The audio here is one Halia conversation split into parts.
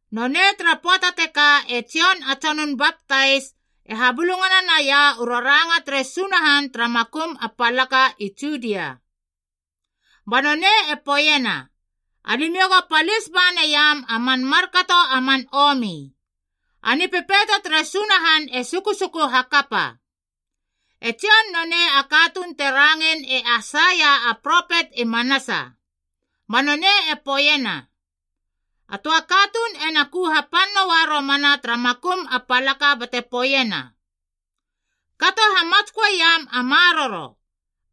Nonei tara pöata tekaa e Jon a Tsonun Baptais, e habulungana naia u raranga tere Sunahan tara makum a palaka i Judia. Ba nonei e poeiena, “Alimiou go palis ba naiam a man markato a man omi. A Nipepeito tere Sunahan e sukusuku hakapa.” E Jon nonei a katuun te rangein e Aisaia a propet i manasa. Ba nonei e poeiena, “A töa katuun ena ku hapan noa romana tara makum a palaka bate poeiena, ‘Kato hamatsköeiam a maroro,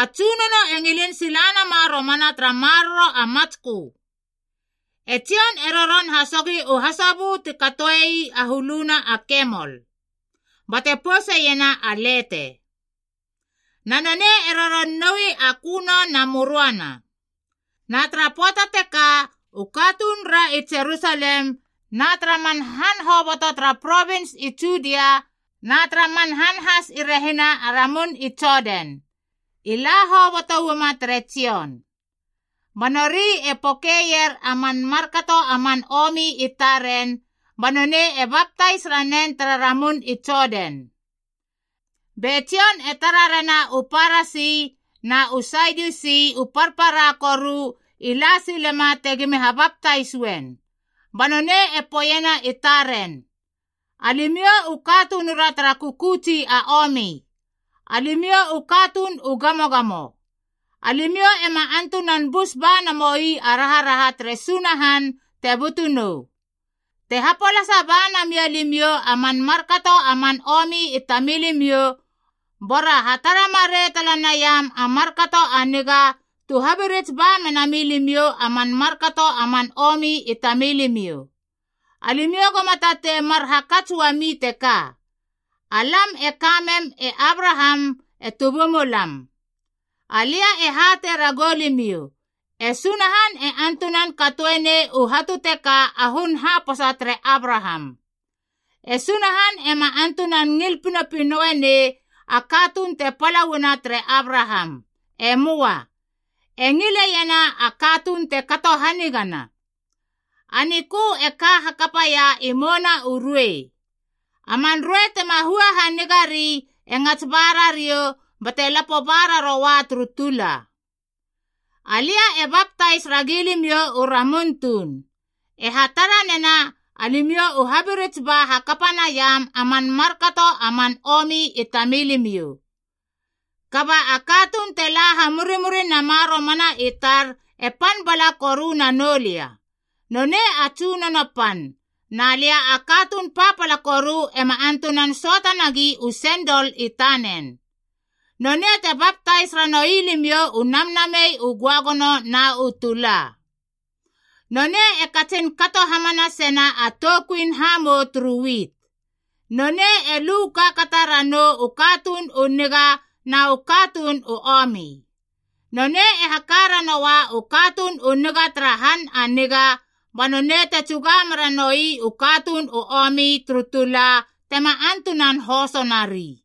a Tsunono e ngilin sila nama romana tara maroro a matskö.’” E Jon e roron hasogi u hasobö ti katoei a huluna a kemol, bate pouseiena a lete. Na nonei e roron noui a köno na möröana. Na tara pöata teka, u katunura i Jerusalem na tara man han hoboto tara provins i Judia na tara man han has i rehina a ramun i Jodan, i la hoboto uama tere Jon. Ba nori e pokeier a man markato a man omi i taren, ba nonei e baptais ranen tara ramun i Jodan. Be Jon e tara rena u Parasib na u Sadiusi u parpara koru i la silema tegimi habaptais uen, ba nonei e poeiena i taren, “Alimiou u katunura tara kökötsi a omi, alimiou u katuun u gamogamo! Alimiou ema antunan bus ba namoi a raharaha tere Sunahan te butu nou! Te hapolasa ba namia limiou a man markato a man omi i tamilimiou, bora hatara marei tala naiam a markato a niga, tu habirits ba menami limiou a man markato a man omi i tamilimiou. Alimiou goma tatei mar hakats uami teka, ‘Alam e kamem e Abraham e tubumulam.’ Alia e hatei ragou limiou, e Sunahan e antunan katoe nei u hatu teka a hun haposa tere Abraham. E Sunahan ema antunan ngil pinopinoe nei a katuun te pala uana tere Abraham. E möa. E ngileiena a katuun te kato hanigana. A nikö e ka hakapaia i mouna u ruei. A man ruei tema hua haniga ri e ngats ba rariou bate lapo ba raroa turu tula. “Alia e baptais ragi limiou u ramun tuun, e hatara nena alimiou u habirits ba hakapa naiam a man markato a man omi i tamilimiou. Kaba a katuun te la hamurimuri nama romana i tar e pan bala koru nanou lia. Nonei a tsunono pan, na lia a katuun papala koru ema antunan söata nagi u sendol i tanen. Nonei te baptais ranoui limiou u Namnamei u Göagono na u tula. Nonei e katsin kato hamanasena a toukuin hamou turu wit. Nonei e lu kaakata ranou u katuun u niga na u katuun u omi. Nonei e haka ranoa u katuun u niga tara han a niga, ba nonei te tsuga mera noi u katuun u omi turu tula tema antunan hoso nari.”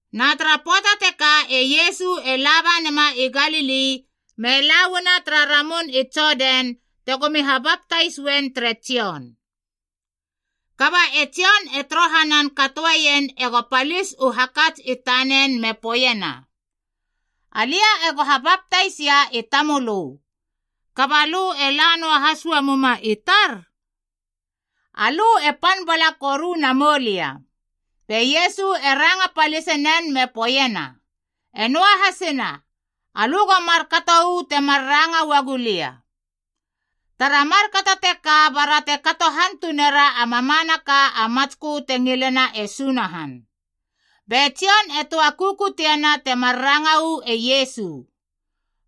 Na tara pöata teka e Iesu e la ba nema i Galili me la uana tara ramun i Jodan tegomi habaptais uen tere Jon. Kaba e Jon e torohanan katoeien ego palis u hakats i tanen me poeiena, “Alia ego habaptaisia i tamölö, kaba lö e la noa has uamuma i tar? Alö e pan bala koru namou lia.” Be Iesu e ranga palisenen me poeiena, “E noahasina alö go markato uu temar ranga uagu lia. Tara markato teka bara te kato hantunera a mamanaka a matskö te ngilena e Sunahan.” Be Jon e töa kukutiena temar ranga uu e Iesu.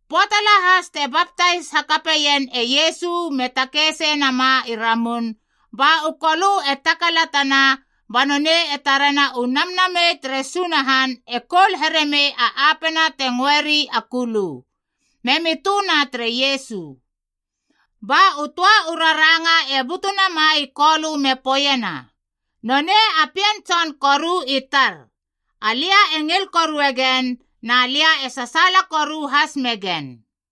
Pöata lahas te baptais hakapeien e Iesu me takei sei nama i ramun, ba u kolö e takalatana, ba nonei e tarena u Namnamei tere Sunahan e koul heremei a apena te ngöeri a kulu, memi töna tere Iesu. Ba u töa u raranga e butu nama i Kolö me poeiena, “Nonei a Pien Tson koru i tar. Alia e ngil korue gen, na lia e sasaala koru has megen.”